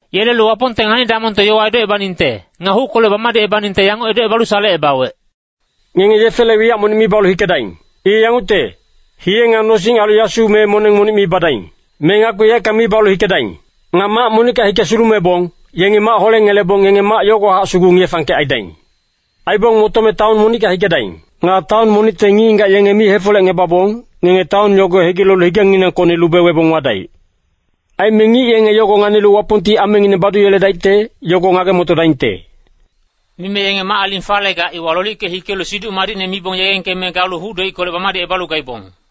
Yelelu Wapongte ngani-damongte yowa edocebaningte, nga huckolec bamadicebaningte yanguc edocebalu salecebawec, “Ngenge yefele wiyac monic mi balu hikedaing. I yangucte, hiye nga nosing ailu yasu me moneng monic mi badaing. Me ngakpi yaeckang mi balu hikedaing. Nga mac monicka hike sulumebong, yenge mac holengelebong ngenge mac yogowahac sugu ngiye-fangkec aidaing. Aibong motome taon monicka hikedaing. Nga taon monicte ngic-ngigac yenge mi hefolecngebabong, ngenge taon yogo hegilelu higenginangkocni lube webong wadaic. Aime ngic yenge yogo nganilu Wapongti amengineng baduyeledaicte, yogo ngage-motodaingte.” Mime yenge mac-aling falegac, iwa lolicke hikelu Siduc Madicne mibong yegengkeme galu huc-doickolec bamadicebalu gaibong.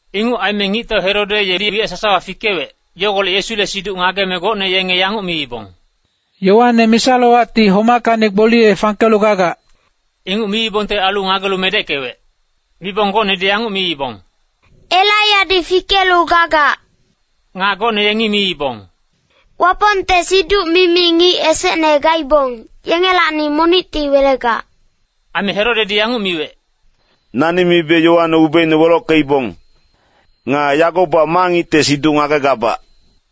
Inguc aime ngictau Herode yedi wiyac sasawa fikewec, yogolec Yesule siduc ngageme gocne yenge yanguc miibong, “Yoane misa-lowacti homackacni gboliye fangkelu gagac.” Inguc miibongte ailu ngagelu medeckewec. Mibong gocnedi yanguc miibong, “Elaiyadi fikelu gagac.” Nga gocne yengi miibong, “Wapongte siduc-mimi ngic esecne gaibong, yengelacni monicti welegac.” Aime Herodedi yanguc miwec, “Nani mibe Yoane ubeine welockeibong. Nga yagobac ma ngicte siduc ngagegabac.”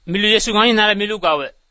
Milu Yesu nganinale milu gawec.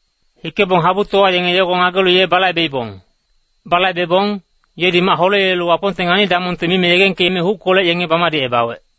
Hikebong habutowa yenge yogo ngagelu ye balaibeibong. Balaibebong, yedi mac holeyelelu Wapongte ngani-damongte mime yegengkeme huckolec yenge bamadicebawec.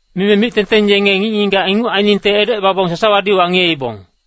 Mime mic-tengteng yenge ngic-ngigac inguc ainingte edocebabong sasawadi wangiyeibong.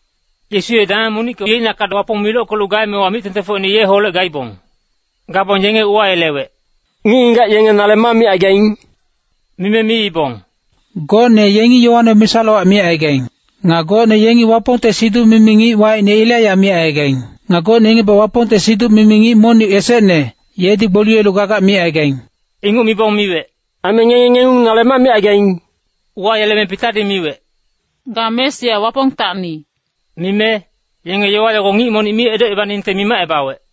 Yesu ye dameng monicka yeicnakac Wapong milockelu gaemewa mic-tengtengfocine yeholec gaibong. Gabong yenge uwayelewec, “Ngic-ngigac yenge nale ma micaigaing?” Mime miibong, “Gocne yengi Yoane misa-lowac micaigaing. Nga gocne yengi Wapongte siduc-mimi ngic wacine Elaiya micaigaing. Aime gocne yengibac Wapongte siduc-mimi ngic monic esecne, yedi gboliyelu gagac micaigaing.” Inguc mibong miwec, “Aime ngenge ngengung nale ma micaigaing?” Uwayeleme Pitadi miwec, “Ga Mesia Wapongtacni.” Mime, yenge yowa yogo ngic monic mi edocebaningte mimacebawec.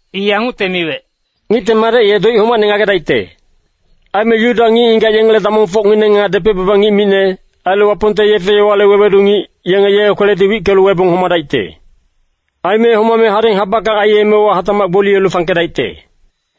I yangucte miwec, “Ngicte Madec ye doic homacne ngagedaicte. Aime Yuda ngic-ngigac yengele damongfocngineng nga depec-baba ngic micne, ailu Wapongte yefe-yowale wewedu ngic, yenge ye kweledi wickelu webong homadaicte. Aime homame hadeng habackang aiyemewa hatacmac gboliyelu fangkedaicte.”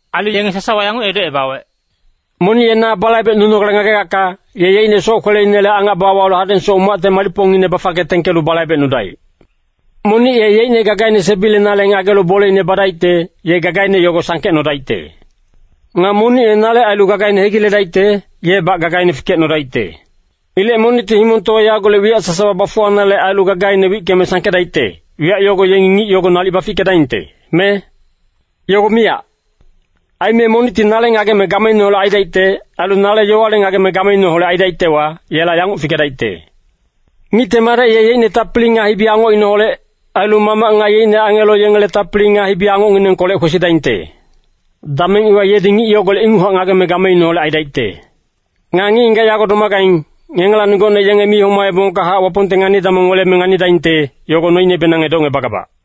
Ailu yenge sasawa yanguc edocebawec, “Monic ye na balaibecnunogale ngagegacka, ye yeicne soc-kweleinele angac bawalu hadengsoc umacte malicpongine bafangke tengkelu balaibecnudaic. Monic ye yeicne gagaine sebilenale ngagelu boleine badaicte, ye gagaine yogo sangkecnodaicte. Nga monic ye nale ailu gagaine hegiledaicte, yebac gagaine fikecnodaicte. Ilec monicti himongtowa yagolec wiyac sasawa bafuwanale ailu gagaine wickeme sangkedaicte, wiyac yogo yengi ngic yogo nalic bafickedaingte, me? Yogo miyac! Aime monicti nale ngageme gameineholec aidaicte, ailu nale yowale ngageme gameineholec aidaictewa, yela yanguc fikedaicte. Ngicte Madec ye yeicne tapili nga hibi-angocineholec, ailu Mamac nga yeicne angelo yengele tapili nga hibi-angocnginengkolec kwesidaingte. Dameng iwa yedi ngic yogolec inguchac ngageme gameineholec aidaicte. Nga ngic-ngigac yago domagaing, ngengelacni gocne yenge mi homaebongkahac Wapongte ngani-damong weleme nganidaingte, yogo noinebenang edocngebagabac.”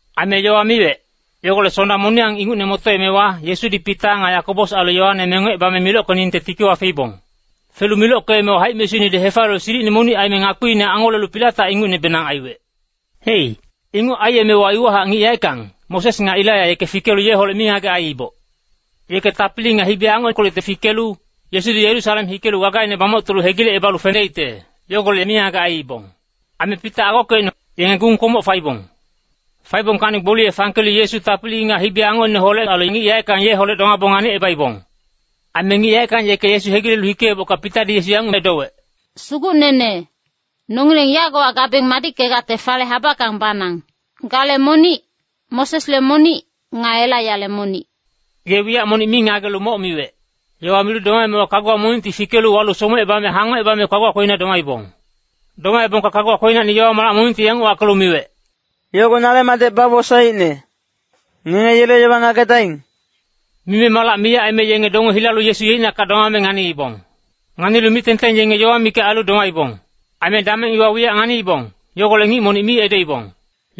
Aime yowa miwec, yogolec Sonda moniyang ingucne motoemewa, Yesudi Pita nga Yakobos ailu Yoane mengocebame milockeningte tikiwa feibong. Felu milockeemewa haic-mesuinedi hefaliyelu silicine monic aime ngakpiine angolelu pilatac ingucnebenang aiwec. Hei, inguc aiyemewa iwahac ngic yaeckang, Moses nga Elaiya, yeke fikelu yeholec mingagec aiiboc. Yeke tapili nga hibi-angockolecti fikelu, Yesudi Yerusalem hikelu gagaine bamoctolu hegilecebalu fedaicte, yogolec mingagec aiibong. Aime Pita nga agokecine, yenge gung-kwomoc faibong. Faibongkacni gboliye fangkelu Yesu tapili nga hibi-angocineholec ailu ngic yaeckang yeholec domaboc nganicebaibong. Aime ngic yaeckang yeke Yesu hegilelu hikeebocka Pitadi Yesu yanguc edowec, “Sugucnene, nongileng yagowa gabeng madickegacte fale habackang banang. Gale monic, Mosesle monic, nga Elaiyale monic.” Ye wiyac monic mi ngagelu moc miwec. Yowa milu domaemewa kaguwa monicti fikelu walu somecebame hangocebame kaguwa kwelina domaibong. Domaebongka kaguwa kwelinacni yowa-malac monic yanguc wackelu miwec, “Yogo nale Madec bawosaeicne. Ngenge yele yowa ngagedaing!” Mime malac miyac aime yenge donge hilalu Yesu yeicnakac domame nganiibong. Nganilu mic-tengteng yenge yowa mikac ailu domaibong. Aime dameng iwa wiyac nganiibong, yogolec ngic monic mi edoibong.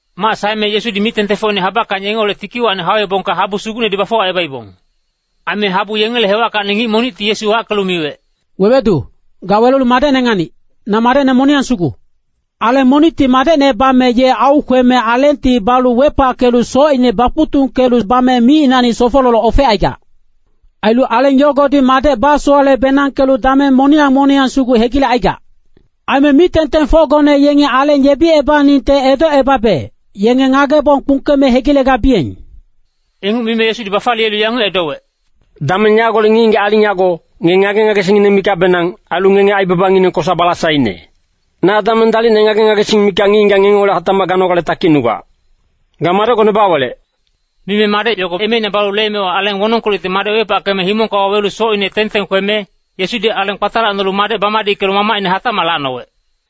Mac saeme Yesudi mic-tengtengfocine habackang yengeholec tikiwacni hauebongka habu sugucnedi bafuwacebaibong. Aime habu yengele hewackacni ngic monicti Yesu wackelu miwec, “Wewedu, ga welelu madecne nganic, na madecne moniyang sugu. Aleng monicti madecne bame ye aukweme alengti balu wepackelu socine bakuctungkelu bame micinacni sofololoc ofecaigac. Ailu aleng yogodi madec basowale-benangkelu dameng moniyang moniyang sugu hegilecaigac. Aime mic-tengtengfocgone yengi aleng yebiyeningte edocebabe, yenge ngagebong kpungkeme hegilegabiyeng.” Inguc mime Yesudi bafaliyelu yanguc edowec, “Dameng yagolec ngic-ngigac aling yago, ngenge ngage-ngagesingngineng mikacbenang, ailu ngenge aibabangineng kosa-balasaine. Na dameng dalicne ngage-ngagesing mikac ngic-ngigac ngengeholec hatacmac ganogale takicnugac. Ga madecgone bawelec!” Mime madec yogo emeina balu leemewa, aleng wonongkolecti madec wepackeme himongka wawelu socine teng-teng kweme, Yesudi aleng kpatalacnolu madec bamadickelu mamacine hatacmac lacnowec.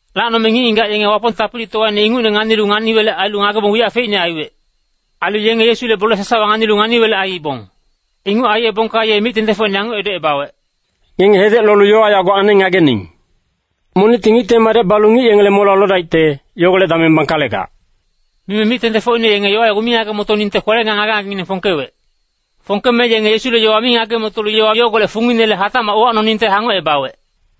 Lacnome ngic-ngigac yenge Wapong tapilitowaine ingucne nganilu ngani-welec ailu ngagebong wiyac feicne aiwec. Ailu yenge Yesule bole sasawa nganilu ngani-welec aiibong. Inguc aiyebongka ye mic-tengtengfocine yanguc edocebawec, “Ngenge hedec lolu yowa yago aneng ngagening! Monicti Ngicte Madec balu ngic yengele molewa lodaicte, yogolec dameng bangkalegac.” Mime mic-tengtengfocine yenge yowa yogo mi ngage-motoningte kwele nga ngage-ngagengineng fongkewec. Fongkeme yenge Yesule yowa mi ngage-motolu yowa yogolec funginele hatacmac uwacnoningte hangocebawec.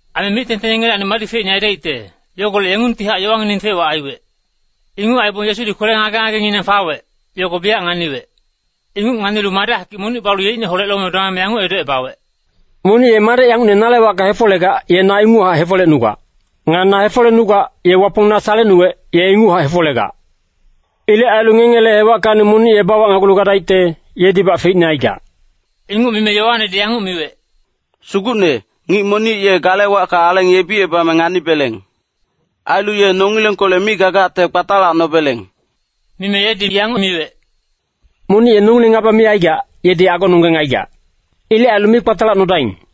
Aime mic-tengteng yengelacni madi feicne aidaicte, yogolec yengungtihac yowangineng fec-wac aiwec. Inguc aibong Yesudi kwele ngage-ngagenginang fawec, yogo biyac nganiwec. Inguc nganilu madec hakic monic balu yeicneholec lome domame yanguc edocebawec, “Monic ye madec yangucne nale wacka hefolegac, ye na inguchac hefolecnugac. Nga na hefolecnugac, ye Wapong na salecnuwec, ye inguchac hefolegac. Ilec ailu ngengele hewackacni monic ye bawacnagulu gadaicte, yedibac feicne aigac.” Inguc mime Yoanedi yanguc miwec, “Sugucne, ngic monic ye gale wacka aleng yebicebame nganibeleng. Ailu ye nongilengkolec mi gagacte kpatalacnobeleng.” Mime yedi yanguc miwec, “Monic ye nongileng ngaba mi aigac, yedi agononggeng aigac. Ilec ailu mi kpatalacnodaing.”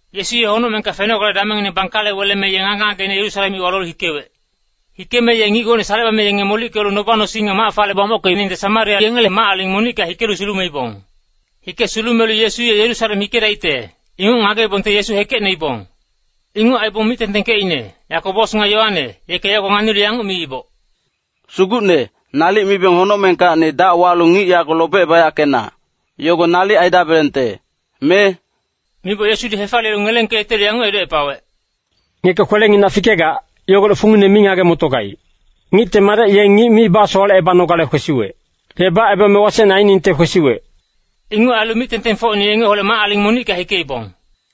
Yesu ye honocmengka fenogale damengngine bangkale weleme, ye ngage-ngageine Yerusalem iwa lolu hikewec. Hikeme ye ngic gocne salecebame yenge molickelu noba-nosing nga mac fale bamockeningte Samaria yengele mac-aling monicka hikelu sulumeibong. Hike sulumelu Yesu ye Yerusalem hikedaicte, inguc ngageibongte Yesu hekecnoibong. Inguc aibong mic-tengtengkecine, Yakobos nga Yoane, yeke yogo nganilu yanguc miiboc, “Sugucne, nalic mibeng honocmengkacni dac walu ngic yago lobecebayackena, yogo nalic aidabelengte, me?” Miboc Yesudi hefaliyelu ngelengkeyetelu yanguc edocepawec, [“Ngeke kwelenginac fikegac, yogolec fungine mi ngage-motogaic. Ngicte Madec ye ngic mi basowalecebanogale kwesiwec. Ye bacebame wasecne ainingte kwesiwec.”] Inguc ailu mic-tengtengfocine yengeholec mac-aling monicka hikeibong.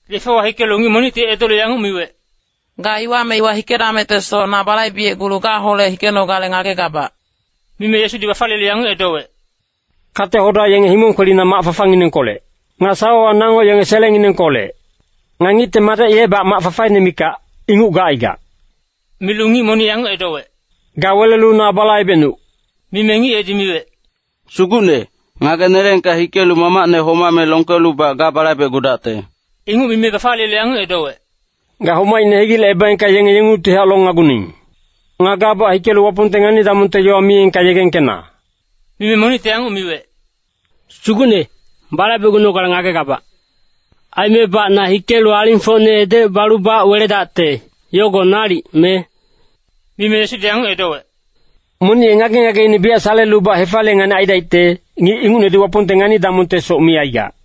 Yefewa hikelu ngic monicti edolu yanguc miwec, “Ga iwa me iwa hikedamectesoc na balaibecgulu gaholec hikenogale ngagegabac.” Mime Yesudi bafaliyelu yanguc edowec, “Kate-hoda yenge himong kwelina mac fafanginengkolec. Nga sawawa nango yenge selengnginengkolec. Nga Ngicte Madec yebac mac fafaine mikac, inguc gacaigac.” Milu ngic monic yanguc edowec, “Ga welelu na balaibecnuc!” Mime ngic yedi miwec, “Sugucne, ngageneleengka hikelu mamacne homame longkelubac ga balaibecgudacte.” Inguc mime bafaliyelu yanguc edowec, “Ga homaicne hegilecebaengka yenge yengungtihac longnaguning. Nga gabac hikelu Wapongte ngani-damongte yowa miyengka yegengkena.” Mime monicti yanguc miwec, “Sugucne, balaibecgunogale ngagegabac. Aimebac na hikelu alingfocne edocebalubac weledacte, yogo nalic, me?” Mime Yesudi yanguc edowec, “Monic ye ngage-ngageine biyac salelubac hefaliye-nganic aidaicte, ngic ingucnedi Wapongte ngani-damongtesoc mi aigac.”